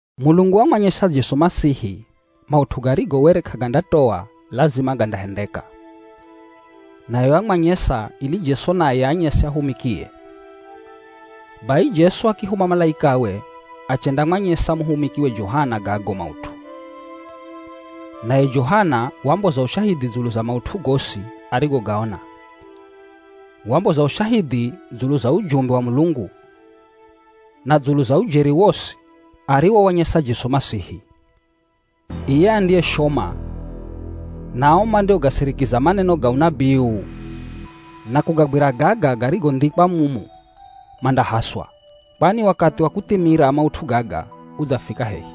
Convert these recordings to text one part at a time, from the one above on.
Mulungu wamwanyesa Jesu Masihi maut'u garigo were k'agandatoa lazima gandahendeka. Naye wamwanyesa ili Jesu naye aanyese ahumikie. Bai Jesu akihuma malaikawe achendamwanyesa muhumikiwe Johana gago maut'u. Naye Johana wamboza ushahidhi dzulu za maut'u gosi arigogaona. Wamboza ushahidhi dzulu za ujumbe wa Mulungu, na dzulu za ujeri wosi ariwowanyesa Jesu Masihi. Iye andiyeshoma, na ao mandiogasirikiza maneno ga unabii uu, na kugagwira gaga garigondhikwa mumu, mandahaswa. Kwani wakathi wa kuthimira maut'u gaga udzafika hehi.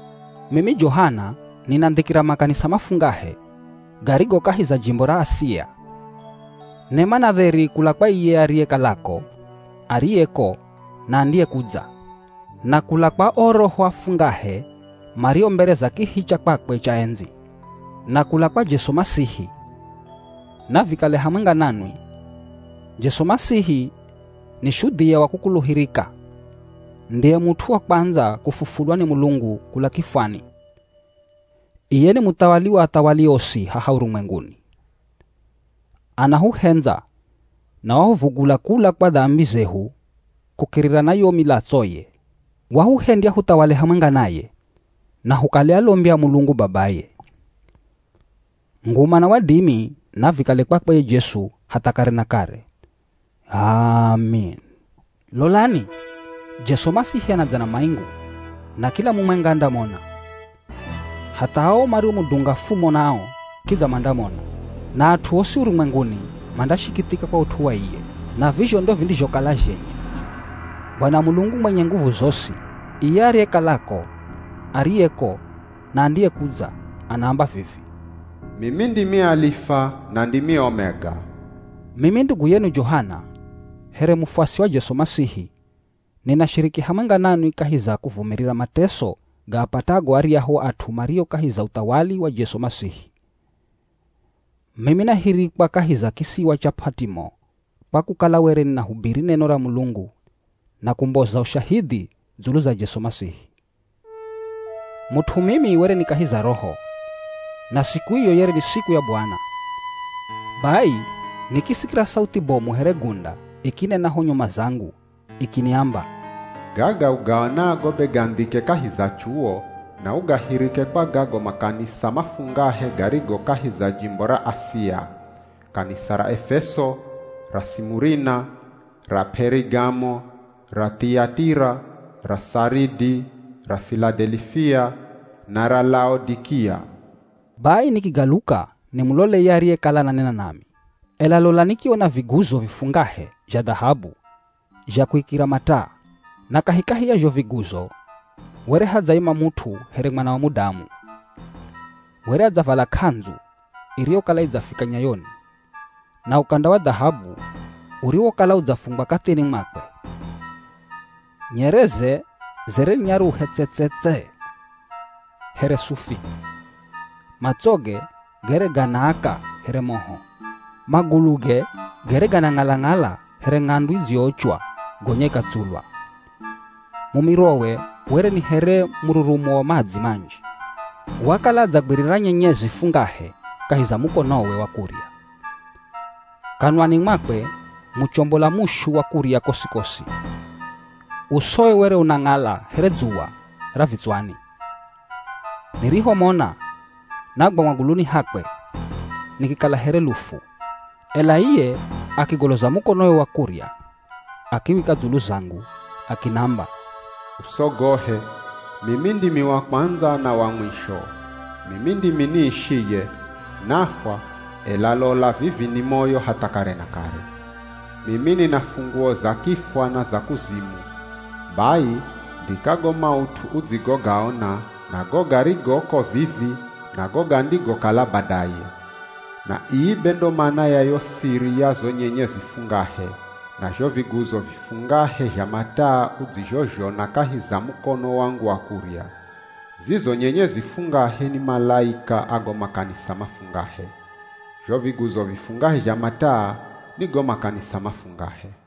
Mimi Johana, ninandhikira makanisa mafungahe garigo kahi za jimbo ra Asia. Nema na dheri kula kwa iye ariyekalako, ariyeko, na andiyekudza, na kula kwa o roho afungahe mario mbere za kihi cha kwakwe cha endzi, na kula kwa Jesu Masihi, navikale hamwenga nanwi. Jesu Masihi, ni shudhia wa kukuluhirika, ndiye mut'u wa kwandza kufufulwa ni Mulungu kula kifwani. Iye ni muthawali wa athawali osi haha urumwenguni. Anahuhendza na wahuvugula kula kwa dambi zehu kukirira na yo milatsoye. Wahuhendya huthawale hamwenga naye, na hukale alombi a Mulungu babaye. Nguma na wadimi navikale kwakwe ye Jesu hatha kare na kare. H'aami. Lolani, Jesu Masihi anadza na maingu, na kila mumwenga andamona. Hatha ao mariomudunga fumo nao kidza mandamona. Na at'u osi urumwenguni mandashikithika kwa ut'u wa iye. Na vizho ndo vindizhokala zhenye. Bwana Mulungu mwenye nguvu zosi, iye ariyekalako, ariyeko, na andiyekudza anaamba vivi, “Mimi ndimi Alifa na ndimi Omega.” Mimi ndugu yenu Johana, here mufuasi wa Jesu Masihi, ninashiriki hamwenga nanwi kahi za kuvumirira mateso gaapatago aryahu at'u mario kahi za uthawali wa Jesu Masihi. Mimi nahirikwa kahi za kisiwa cha P'at'imo kwa kukala were ninahubiri neno ra Mulungu na kumboza ushahidhi dzulu za Jesu Masihi. Mut'u mimi were ni kahi za Roho, na siku iyo yere ni siku ya Bwana. Bai, nikisikira sauthi bomu here gunda ikinena ho nyuma zangu ikiniamba, “Gaga ugaonago be gandhike kahi za chuwo, na ugahirike kwa gago makanisa mafungahe garigo kahi za jimbo ra Asia: Kanisa ra Efeso, ra Simurina, ra P'erigamo, ra Thiyatira, ra Saridi, ra Filadelifia, na ra Laodikia.” Bai nikigaluka nimulole ye ariyekala ananena nami, ela lola nikiona viguzo vifungahe zha dhahabu zha kuikira mataa. Na kahikahi ya zho viguzo, were hadzaima mut'u here Mwana wa Mudamu. Were adzavala k'andzu iriyokala idzafika nyayoni, na ukanda wa dhahabu uriwokala udzafungwa kathini mwakwe. Nyereze zere ni nyaruhe tse-tse-tse here sufi. Matsoge gere ganaaka here moho. Maguluge gere ganang'ala-ng'ala here ng'andu idziyoochwa gonya ikatsulwa. Mumirowe were ni here mururumo wa madzi manji. Wakala adzagwirira nyenyezi fungahe kahi za mukonowe wa kurya. Kanwani mwakwe muchombola mushu wa kurya kosi-kosi. Usowe were unang'ala here dzuwa ra vitswani. Nirihomona, nagwa maguluni hakwe, nikikala here lufu. Ela iye akigoloza mukonowe wa kurya akiwika dzulu zangu akinamba, “Usogohe, mimi ndimi wa kwandza na wa mwisho. Mimi ndimi niishiye. Nafwa, ela lola vivi ni moyo hatha kare na kare. Mimi nina funguo za kifwa na za kuzimu. Bai, ndhika go maut'u udzigogaona, na go garigoko vivi, na go gandigokala badaye. Na ii be ndo mana ya yo siri ya zo nyenyezi fungahe, na zho viguzo vifungahe zha mataa udzizhozhona kahi za mukono wangu wa kurya. Zizo nyenyezi fungahe ni malaika a go makanisa mafungahe. Zho viguzo vifungahe zha mataa, ni go makanisa mafungahe.”